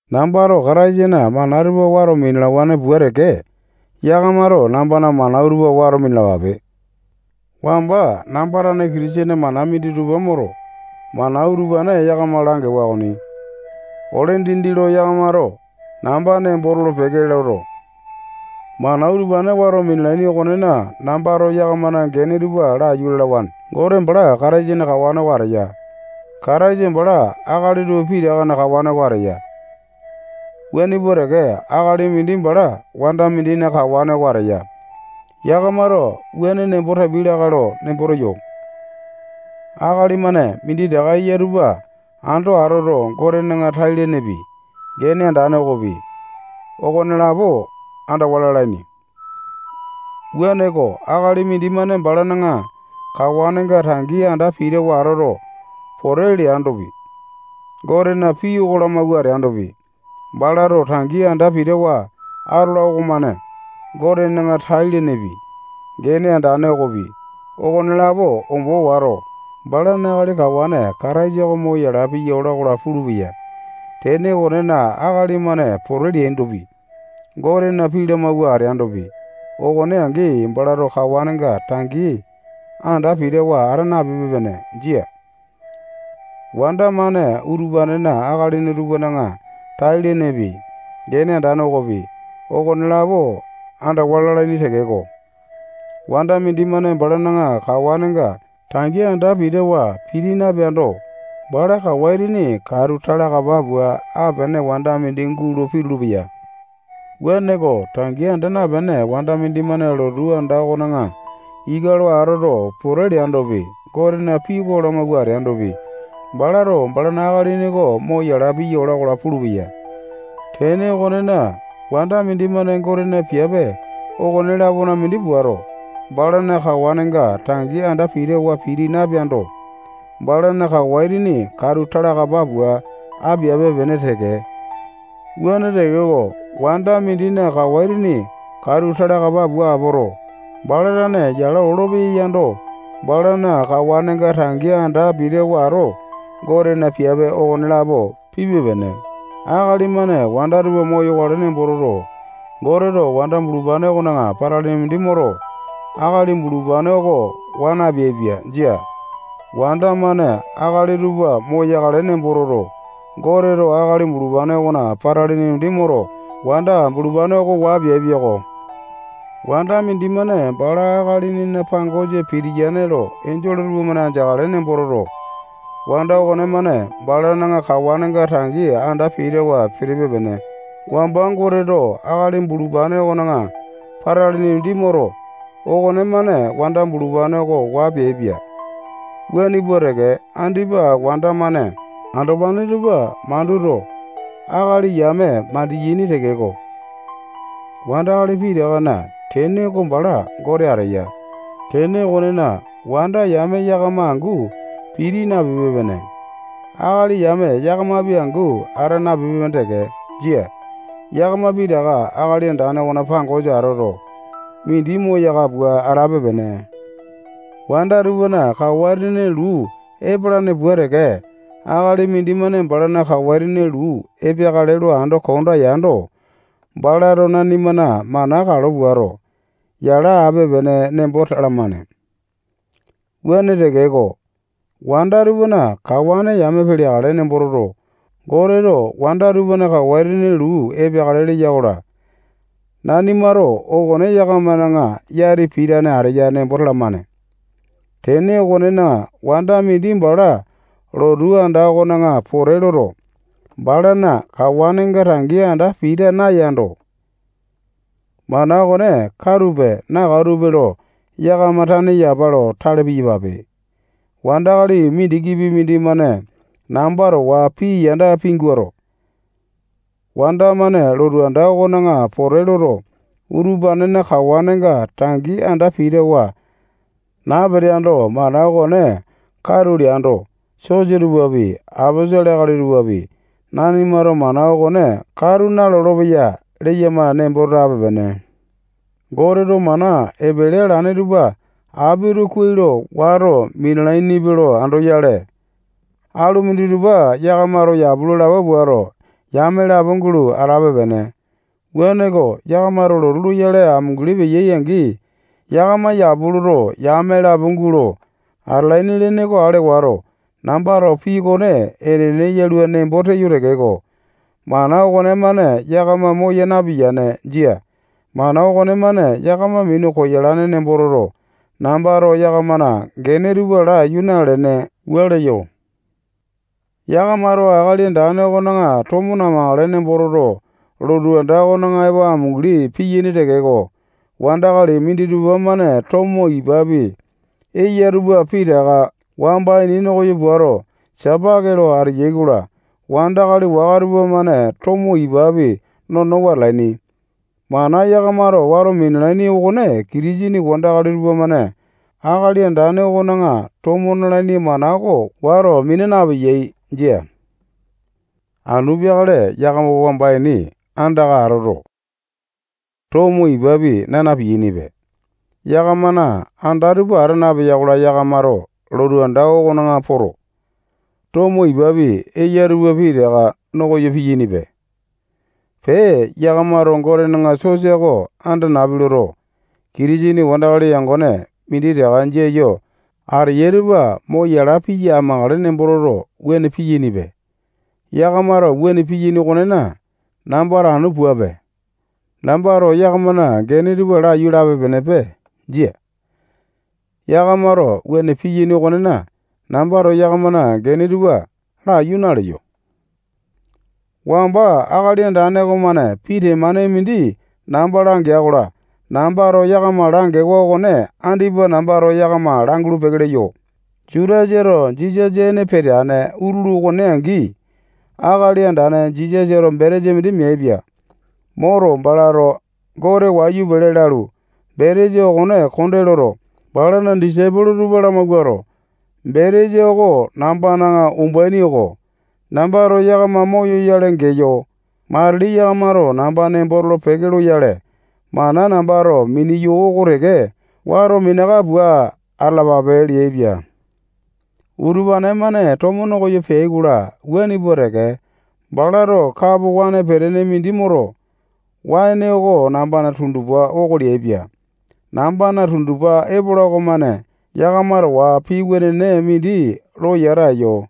Nambato Kataisana mana tupa wato minalawane pua teke, yakamato nambana mana utupane wato minalapape. Wamba namba tane Kitisene mana minditupa moto, mana utupane yakama langewa okoni. Ole dindi lo yakamato namba nembo tolo-peke loto, mana utupane wato minalaini okonena, nambato yakamana gene tupa laiyu lalawane. Gote bala Kataisana kawane oko ateya. Kataisa bala akali tupa pitakana kawane oko ateya. Wuane pua teke, akali mindi bala wanda mindina kawane oko ateya. Yakamato wuane nembo tapiai lakae lo nembo teyo. Akali-mane minditaka eya tupa ando atoto, Gotena tai-lenepi, gene andane okopi, okonelapo andawa lalaini. Wuaneko, akali mindimane balana kawanenga tangi anda pitawa atoto, pote leandopi, Gotena pii oko lamawua ateandopi, balato tangi anda pitawa atola okomane Gotena tai-lenepi, gene andane okopi, okonelapo ombo wato, balana akali kawane Kataisa oko mo yala piya ola-kola pulupeya. Tene okonena, akali-mane pote leandopi, Gotena pii lamawua ateandopi, okone angi balato kawanenga tangi anda pitawa ata napipe-pene. Jia. Wanda-mane utupanena akalini tupana tai-lenepi, gene andane okopi, okonelapo andawa lalaini tekeko, wanda mindimane balana kawanenga tangi anda pitawa piti napeando, bala kawa itini katu talakapa pua apene wanda mindi gulo pitulu-peya. Wuaneko, tangi anda napene wanda mindimane lotu anda okona ika lo atoto, pote leandopi, Gotena pii oko lamawua ateandopi, balato balana akalini oko mo yala piya ola-kola pulupeya. Tene okonena, wanda mindimane Gotena piape okone-lapona mindi puato, balana kawanenga tangi anda pitawa piti napeando, balana kawa itini katu talakapa pua apiape-pene teke. Wuane tekeko, wanda mindina kawa itini katu talakapa pua apoto, bala tane yala olopeya yando, balana kawanenga tangi anda pitawa ato, Gotena piape okonelapo pipe-pene. Akali-mane wanda tupa moyakale nembo toto, Goteto wanda bulupane okona patalini mindi moto, akali bulupane oko waa napeaipia. Jia. Wanda-mane akali tupa moyakale nembo toto, Goteto akali bulupane okona patalini mindi moto, wanda bulupane oko waa peaipia-ko. Wanda mindimane bala akalinina pangosa pitiyane lo enjole tupamane andeakale nembo toto, wanda okonemane balana kawanenga tangi anda pitawa pitipe-pene. Wamba Goteto akali bulupane okona patalini mindi moto, okonemane wanda bulupane oko waa peaipia. Wuane pua teke, andipa wanda-mane andopane tupa manduto, akali yame mandiyane tekeko, wandakali pitakana tene oko bala Gote ateya. Tene okonena, wanda yame yakama angu piti napipe-pene. Akali yame yakamapi angu ata napipe-pene teke. Jia. Yakama pitaka Akali Andane okona pangosa atoto, mindi moyaka pua atape-pene. Wanda tupana kawa itini luu epalane pua teke, akali mindimane balana kawa itini luu epeakale lo ando konda yando, balato nanimana mana kalo puato, yala ape-pene nembo talamane. Wuane tekeko, wanda tupana kawane yame peleakale nembo toto, Goteto wanda tupana kawa itini luu epeakale leya-kola, nanimato okone yakamana yati pitane ateya nembo talamane. Tene okonena, wanda mindi bala lotu anda okona pote loto, balana kawanenga tangi anda pita nayando, mana okone katupe, nakatupe lo yakama tane yapa lo tale piyapape. Wandakali mindikipi mindimane namba towa pii yanda pinguato, wanda-mane lotu anda okona pote loto, utupanena kawanenga tangi anda pitawa napeteando, mana okone katu leando, sosa tupapi, aposolo akali tupapi, nanimato mana okone katu nalolo-peya leyama nembo tape-pene. Goteto mana epele alane tupa apito kuai lo wato minalainipe lo andoyale, alu minditupa yakamato yapu lo lapo puato, yame lapo gulo atape-pene. Wuaneko, yakamato lotu loyale amunguli peyai-angi, yakama yapu loto, yame lapo gulo atalaini lene oko ale wato, nambato pii okone enene yalua nembo teyo tekeko, mana okonemane yakama moya napiyane. Jia. Mana okonemane yakama minu koyalane nembo toto, nambato yakamana gene tupa laiyu nalene, wua leyo. Yakamato Akali Andane okona tomo namakale nembo toto, lotu anda okona epo amunguli piyaini tekeko, wandakali minditupa-mane tomo ipapi eya tupa pitaka wamba ini nokoyo puato, sipaki lo ateyai-kola, wandakali waka tupamane tomo ipapi nonowa atalaini. Mana yakamato wato minalaini okone Kitisene wandakali tupamane Akali Andane okona tomo nalaini mana oko wato mina napeyai. Jia. Anu peakale yakama wamba ini andaka atoto, tomo ipapi, naa na-piyainipe. Yakamana anda tupa ata napeya-kola, yakamato lotu anda okona poto, tomo ipapi eya tupa pitaka no koyo piyainipe. Pee, yakamato Gotena sosa oko anda napi loto, Kitisene wandakali yangone minditaka jia yo ateyai tupa mo yala piya amakale nembo toto, wuane piyainipe. Yakamato wuane piyaini okonena, nambato anu puape. Nambato yakamana gene tupa laiyu lape-penepe. Jia. yakamato wuane piyaini okonena, nambato yakamana gene tupa laiyu naleyo. Wamba Akali Andane okomane pii temane mindi namba langea-kola, nambato yakama langewa okone andipa nambato yakama langulu-peke leyo. Jutasato Jisasa ene peteane utulu okone angi, Akali Andane Jisasato betesa mindi meaipia. Moto, balato Gote wayu pele lalu, betesa okone konde loto, balana disaipolo tupa lamawuato, betesa oko nambana umbaini oko. Nambato yakama moyoyale geyo. Matili yakamato namba nembo tolo-peke loyale, mana nambato mineyo oko teke wato minaka pua atalapape leaipia. Utupane-mane tomo no koyo peai-kola, wuane pua teke, balato kapo waene petene mindi moto, waene oko nambana tundupa oko leaipia. Nambana tundupa epola okomane yakama towa pii wenene mindi lo yata eyo.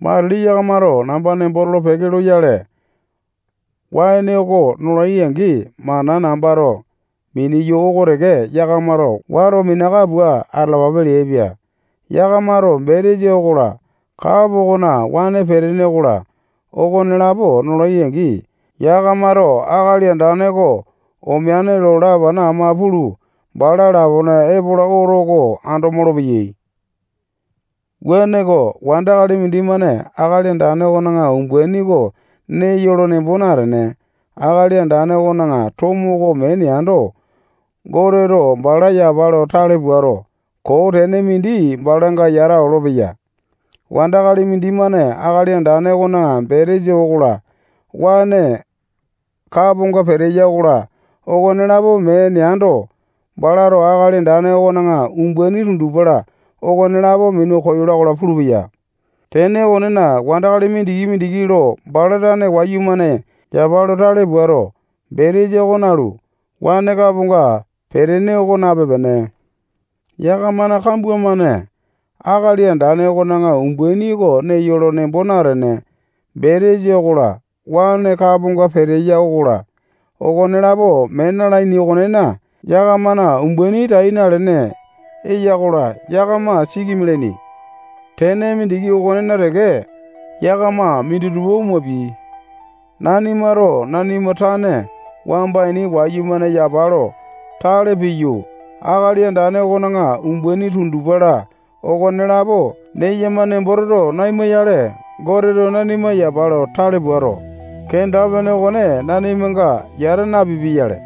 Matili yakamato namba nembo tolo-peke loyale, waene oko nolai angi, mana nambato mineyo oko teke yakamato wato minaka pua atalapape leaipia. Yakamato betesa okola, kapo okona waene petene okola, okonelapo nolai-angi, yakamato Akali Andane oko omeane lo lapana ama pulu, bala lapone epola oto oko ando molopeyai. Wuaneko, wandakali mindimane Akali Andane okona umbaini oko neyo lo nembo natene, Akali Andane okona tomo oko mee neando, Goteto bala yapa lo tale puato, koo tene mindi balanga yata olopeya. Wandakali mindimane Akali Andane okona betesa okola, waene kaponga peteya okola, okonelapo mee neando, balato Akali Andane okona umbaini, tundupa-la, okonelapo minu koyola-kola pulupeya. Tene okonena, wandakali mindiki-mindiki lo bala tane wayumane yapa lo tale puato, betesa oko nalu, waene kaponga petene oko nape-pene. Yakamana kambua-mane Akali Andane okona umbaini oko neyo lo nembo natene, betesa okola, waene kaponga peteya okola, okonelapo mee na-lalaini okonena, yakamana umbaini tai nalene eya-kola, yakama siki mialaini. Tene mindiki okonena teke, yakama minditupa omapiai. Nanimato nanima tane wamba ini wayumane yapa lo tale piyu, Akali Andane okona umbaini tundupa-la okonelapo neyama nembo toto naima-yale, Goteto nanima yapa lo tale puato, kenda-pene okone nanimanga yata napipia-yale.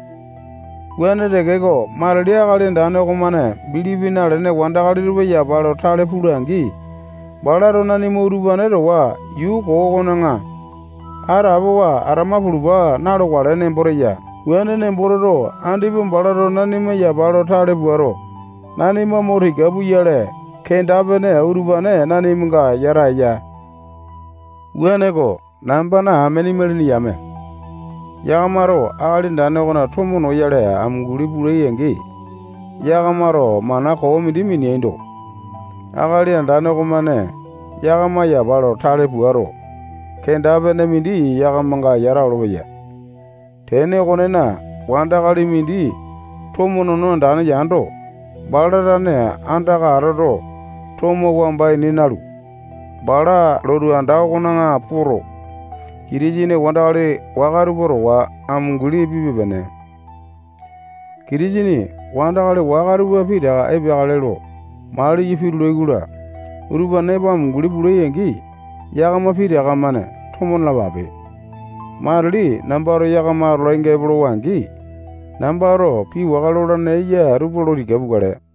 Wuane tekeko, matili Akali Andane okomane bilipi nalene wandakali tupa yapa lo tale pula-angi, balato nanima utupane towa yuu koo okona atapowa atama pulupa na-lokale nembo tewa. Wuane nembo toto, andipa balato nanima yapa lo tale puato, nanima mo tika puyale, kenda-pene utupane nanimanga yata eya. Wuaneko, nambana amene imalini yame, yakamato Akali Andane okona tomo noyale amunguli pulai-angi, yakamato mana koo mindi mineaindo, Akali Andane okomane yakama yapa lo tale puato, kenda-pene mindi yakamanga yata olopeya. Tene okonena, wandakali mindi tomo nono andane yando, bala tane andaka atoto, tomo wamba ini nalu, bala lotu anda okona poto, Kitisene wandakali waka tupa towa amunguli pipe-pene. Kitisene wandakali waka tupa pitaka epeakale lo mali yo pitulai-kola, utupane epo atolai-angi, yakama pitaka-mane tomo nalapape. Matili nambato yakama atolainga epolowa-angi, nambato pii waka lolane eya tupa lo tika pukale.